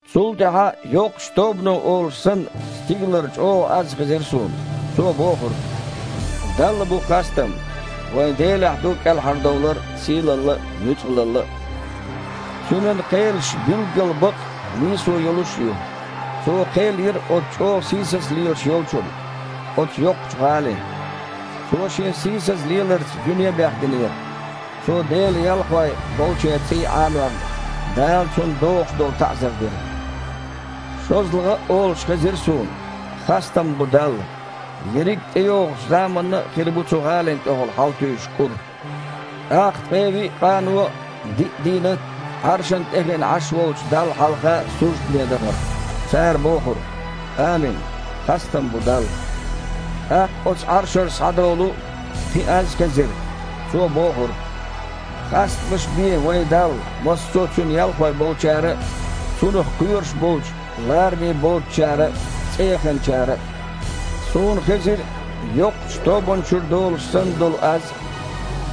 Цул тІаьхьа, йоккхачу тобано олуш санна, стигалара чІогІа аз хезира суна. Цо бохура: «Далла бу хастам! Вайн Делехь ду кІелхьардовлар а, сийлалла а, нуьцкъалалла а. Цуьнан кхелаш билггал бакъ а, нийсо йолуш а ю. Цо кхел йира оцу чІогІа сийсаза лелаш йолчунна, оцу йоккхачу гІалина. Цо шен сийсаза леларца дуьне а бехдинера. Цо Делан ялхой болчеран цІий Іанорна, Дала цунна догІуш долу таІзар дира». ШозлагІа а олуш хезира суна: «Хастам бу Далла! Ерриг а тІейогІучу заманна а хир бу цу гІалина тІехула хьалатуьйсуш кІур». ТІаккха ткъе виъ къано а, диъ дийнат а Іаршана тІехиъна Іаш волчу Далла хьалха суждане дахара. Цара бохура: «Амин! Хастам бу Далла!» ТІаккха оцу Іаршара схьадолу кхин а аз хезира. Цо бохура: «Хастамаш бе вайн Далла массо а Цуьнан ялхой болчара а, Цунах кхоьруш болчу лараме боцучара а, цІеяханчара а». Суна хезира йоккхачу тобанна чуьра долуш санна долу аз а.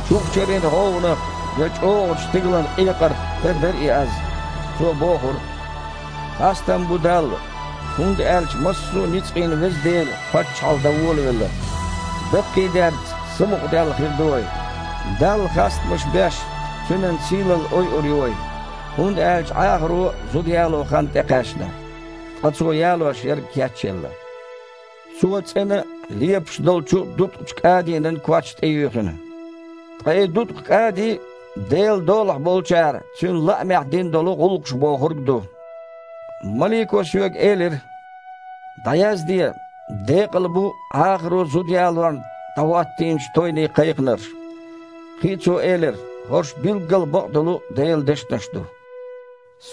Чухчарин гІовгІанах я чІогІачу стигалан къекъарх тера дара и аз. Цо бохура: «Хастам бу Далла! ХІунда аьлча массо а ницкъийн Веза Дела паччахьалла дан волавелла. Даккхийдерца, самукъадаьлла хир ду вай. Далла хастамаш беш, Цуьнан сийлалла ойур ю вай. ХІунда аьлча Іахаро зуда яло хан тІекхаьчна, ткъа Цо ялош ерг кечъелла. Цо цІена а, лепаш долчу а дуткъачу кІадинан коч тІеюьйхина». (Ткъа и дуткъа кІади – Делан долахь болчара Цуьнан лаамехь дина долу гІуллакхаш бохург ду.) Малико соьга элира: «ДІаязде: „Декъала бу Іахаро зуда ялорна дІахІоттийначу тойне кхайкхинарш“». Кхин а цо элира: «ХІорш билггал бакъдолу Делан дешнаш ду».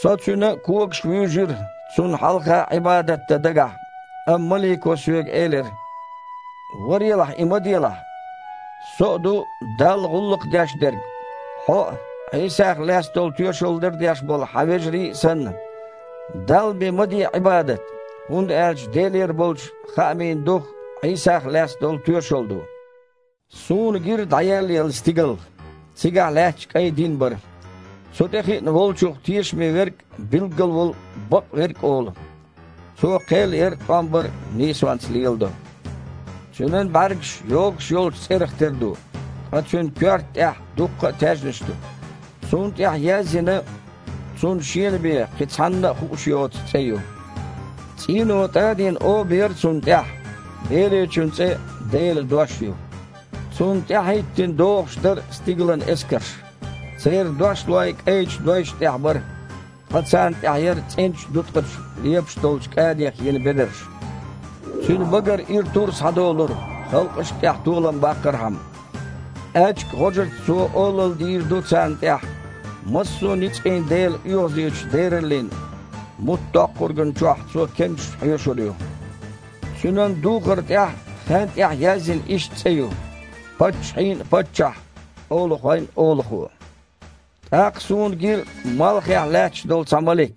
Со цуьнан когашка вуьйжира, цунна хьалха Іибадат дан дагахь, амма малико соьга элира: «Варелахь, и ма делахь! Со а ду Далла гІуллакх деш дерг, хьо а, Іийсах лаьцна долу тоьшалла лардеш болу хьан вежарий а санна. Далла бен ма де Іибадат! ХІунда аьлча Делера болчу хаамийн дух Іийсах лаьцна долу тоьшалла ду». Суна гира дІаеллаелла стигал. Цигахь лаьтташ кІайн дин бара. Цу тІе хиъна Волчух тешаме Верг а, билггал волу бакъ Верг а олу. Цо кхел яр а, тІом бар а нийсонца леладо. Цуьнан бІаьргаш йогуш йолчу цІерах тера ду. Ткъа Цуьнан коьрта тІехь дуккха а таьжнаш ду. Цунна тІехь язйина, Цунна Шена бен, кхин цхьанна а хууш йоцу цІе ю. ЦІийно тІадийна оба яра Цунна тІехь. Беречун цІе «Делан Дош» ю. Цунна тІаьхьахІиттина догІуш дара стигалан эскарш. Церан дошлой кІайчу дойшна тІехь бара, ткъа царна тІехь яра цІеначу дуткъачу лепаш долчу кІадих йина бедарш. Цуьнан багара ира тур схьадолура, халкъашна тІехь толам баккхархьама. Аьчка гІожаца Цо олалла дийр ду царна тІехь. Массо а ницкъийн Делан оьгІазечу дераллин муттдоккхургана чохь Цо кемсаш хьоьшур ю. Цуьнан духар тІехь а, хаьн тІехь а язйина иштта цІе ю: «Паччахьийн а Паччахь, олахойн а Олахо». ТІаккха суна гира малхехь лаьтташ долу цхьа малик.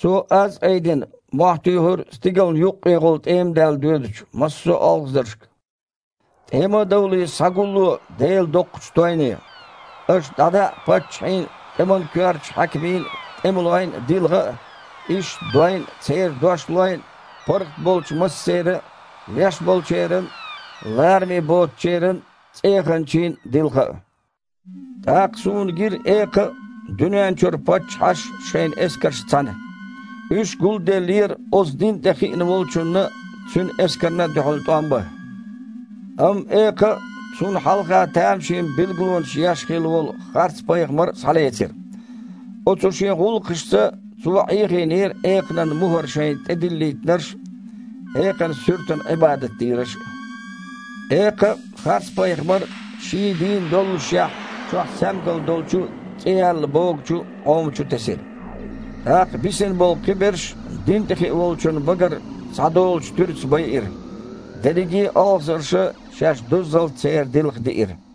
Цо, аз а айдина, мохь туьйхира стигална юккъехула тІемадаьлла доьдучу массо а олхазаршка: «ТІема а довлий, схьагулло Делан доккхачу тойне. Аша дІадаа паччахьийн а, тІеман коьртачу хьаькамийн а, тІемалойн а дилха а, иштта дойн а, церан дошлойн а, паргІат болчу массеран а, леш болчеран а, лараме боцучеран а, цІеяхначийн а дилха а». ТІаккха суна гира экха а, дуьнен чуьра паччахьаш а шайн эскаршца цхьаьна. Уьш гулделлера оцу дин тІе хиъна Волчунна а, Цуьнан эскарна а дуьхьал тІом бан. Амма экха а, цунна хьалха тамашийна билгалонаш еш хилла волу харцпайхамар а схьалецира. Оцу шен гІуллакхашца цо Іехийнера экханан мухІар шайна тІедиллийтинарш а, экханан суьртана Іибадат дийраш а. Экха а, харцпайхамар а, ший а дийна доллушехь, чохь саьмгал долчу а, цІе яьлла богучу а Іома чу тесира. Ткъа бисина болу кхиберш дин тІе хиъна Волчун багара схьадолучу туьраца байира. Дерриге а олхазарша шаьш дуззалц церан дилха диира.